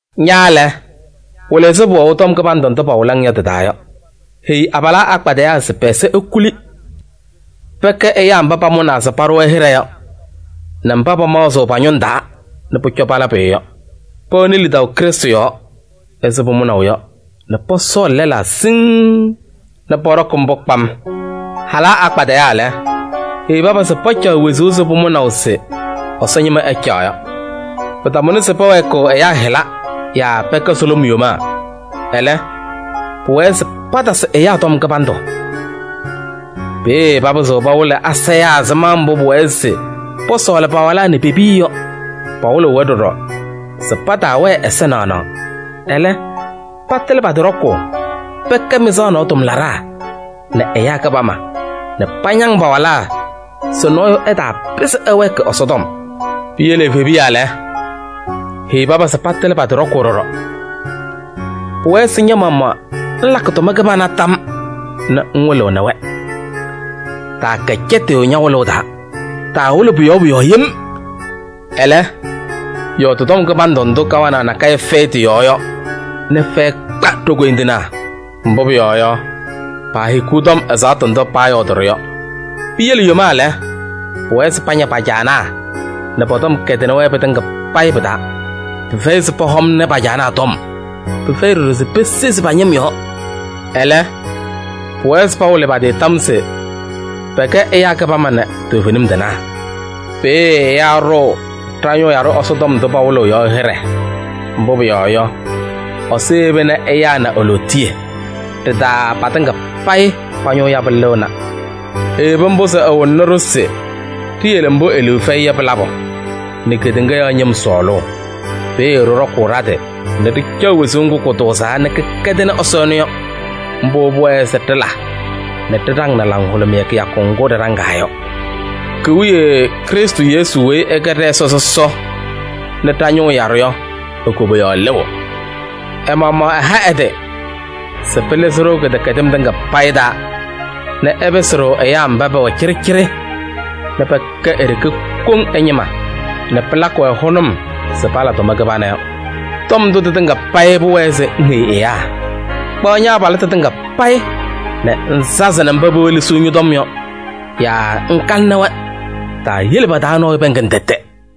Ña lɛ, wɩlɩ ɛzɩ pʋwɛʋ tɔm kɩbandʋ ndʋ pawɩlɩ-ŋ yɔ tɩ-taa yɔ. Heyi abalaa akpadɩyaa se pɛ-ɛza ekuli. Pɛkɛ ɛyaa mba pamʋnaa se paɖʋ-wɛ hɩɖɛ yɔ nɛ mba pamaɣzɩɣ pa-ñʋŋ taa nɛ pʋcɔ pala pʋyʋ yɔ. Pɛwɛnɩ lidaʋ Krɩstʋ yɔɔ ɛzɩ pʋmʋnaʋ yɔ nɛ pɔsɔɔlɩ lɛlaa siŋŋ nɛ pɔɖɔkɩ mbʋ kpam. Halaa akpadɩyaa lɛ, heyi paba se pacaɣ wezuu ɛzɩ pʋmʋnaʋ se Ɛsɔ ñɩma ɛcaɣ yɔ. Pɩtamʋnɩ se pɛwɛɛkɩɣ ɛyaa hɩla yaa pɛkɛ sʋlʋm yomaa. Ɛlɛ, pʋwɛɛ se patasɩ ɛyaa tɔm kɩbandʋ. Peeye papɩzɩɣ pawɩlɩ asayaa ɛzɩma mbʋ pʋwɛɛ se pɔsɔɔlɩ pa-walaa nɛ pe-piya yɔ. Pawɩlɩɣ-wɛ ɖɔɖɔ se pataawɛɛ ɛza naɣnaɣ, ɛlɛ, patɩlɩ pa-tɩ ɖɔkʋʋ. Pɛkɛ mɩzaɣ nɔɔ tʋmlaɖaa nɛ ɛyaa kɩbama nɛ pañaŋ pa-walaa se nɔɔyʋ ɛtaapɩzɩ ɛwɛɛkɩ Ɛsɔtɔm. Piyele evebiya lɛ, heyi paba se patɩlɩ pa-tɩ ɖɔkʋʋ ɖɔɖɔ. Pʋwɛɛ se ña-maɣmaɣ ŋlakɩ tʋma kɩbana tam nɛ ŋwɩlɩɣnɩ-wɛ. Taakɛ cɛtɩyʋ ña-wɩlʋʋ taa, taawɩlɩ pʋ-yɔɔ pʋ-yɔɔ yem. Ɛlɛ, yɔɔdɩ tɔm kɩbandʋ ndʋ kawanaɣ nakɛyɛ fɛyɩ tɩ-yɔɔ yɔ nɛ fɛyɛ kpa ɖo-koyindinaa. Mbʋ pʋyɔɔ yɔ, paahikiɣ tɔm ɛzaɣtʋ ndʋ paayɔɔdɩ-ɖʋ yɔ. Piyele yomaa lɛ, pʋwɛɛ se paña pa-caanaa nɛ pɔ-tɔm kɛdɩnɩ-wɛ pɩtɩŋa pɩ-taa. Pɩfɛyɩ se pɔhɔmnɩ pa-caanaa tɔm. Pɩfɛyɩ ɖɔɖɔ se pesezi pa-ñɩm yɔɔ. Ɛlɛ, pʋwɛɛ se pawɩlɩ pa-tɩ tam se pɛkɛ ɛyaa kɩbama nɛ toovenim tɩnaa. Peeye ɛyaa ɖʋʋ ɖa-ñʋʋ yaɖʋ Ɛsɔ tɔm ndʋ pawɩlɩɣ yɔ hɩɖɛ. Mbʋ pʋyɔɔ yɔ, Ɛsɔ yeba nɛ ɛyaa na e-lootiye. Ɖɩ-taa patɩŋa payɩ pa-ñʋʋ yabʋ lɩɣna. Eyebi mbʋ se ɛwɩlɩɣnɩ-ɖʋ se ɖiyele mbʋ e-liu fɛyɩ yɔ pɩ-labʋ nɛ kedeŋa yɔɔ ñɩm sɔɔlʋʋ. Peeye ɖɩɖɔkʋʋ ɖa-tɩ nɛ ɖɩcaɣ wezuu ŋgʋ kʋtʋʋzaa nɛ kɩkɛdɩnɩ Ɛsɔ ɛnʋ yɔ. Mbʋ pʋwɛɛ se ɖɩla nɛ ɖɩɖaŋnɩ laŋhʋlʋmɩyɛ kɩyakʋ ŋgʋ ɖɩɖaŋaa yɔ. Ki-wiye Krɩstʋ Yesu weyi ɛkɛ ɖɛ-Ɛsɔ sɔsɔ nɛ ɖa-ñʋʋ yaɖʋ yɔ e-koboyaɣ lɩɣ. Ɛ-maɣmaɣ ɛha ɛ-tɩ se pɩlɩzɩ-ɖʋ kɩdɛkɛdɩm tɩŋa payɩ taa nɛ ɛpɩsɩ-ɖʋ ɛyaa mba pɛwɛ cɩɖɩcɩɖɩ nɛ pɛkɛ e-ɖeke koŋ ɛ-ñɩma nɛ pɩlakɩ-wɛ hʋnʋm se pala tʋma kɩbana yɔ. Tɔm ndʋ tɩtɩŋa payɩ pʋwɛɛ se ŋheyi ɛyaa. Kpaɣ ña-abalɩtʋ tɩŋa payɩ nɛ ŋsazɩnɩ mba pewelesiɣ ñɔ-tɔm yɔ yaa ŋkalɩnɩ-wɛ. Taayele pa-taa nɔɔyʋ pɛɛŋ-ŋ tɛtɛ.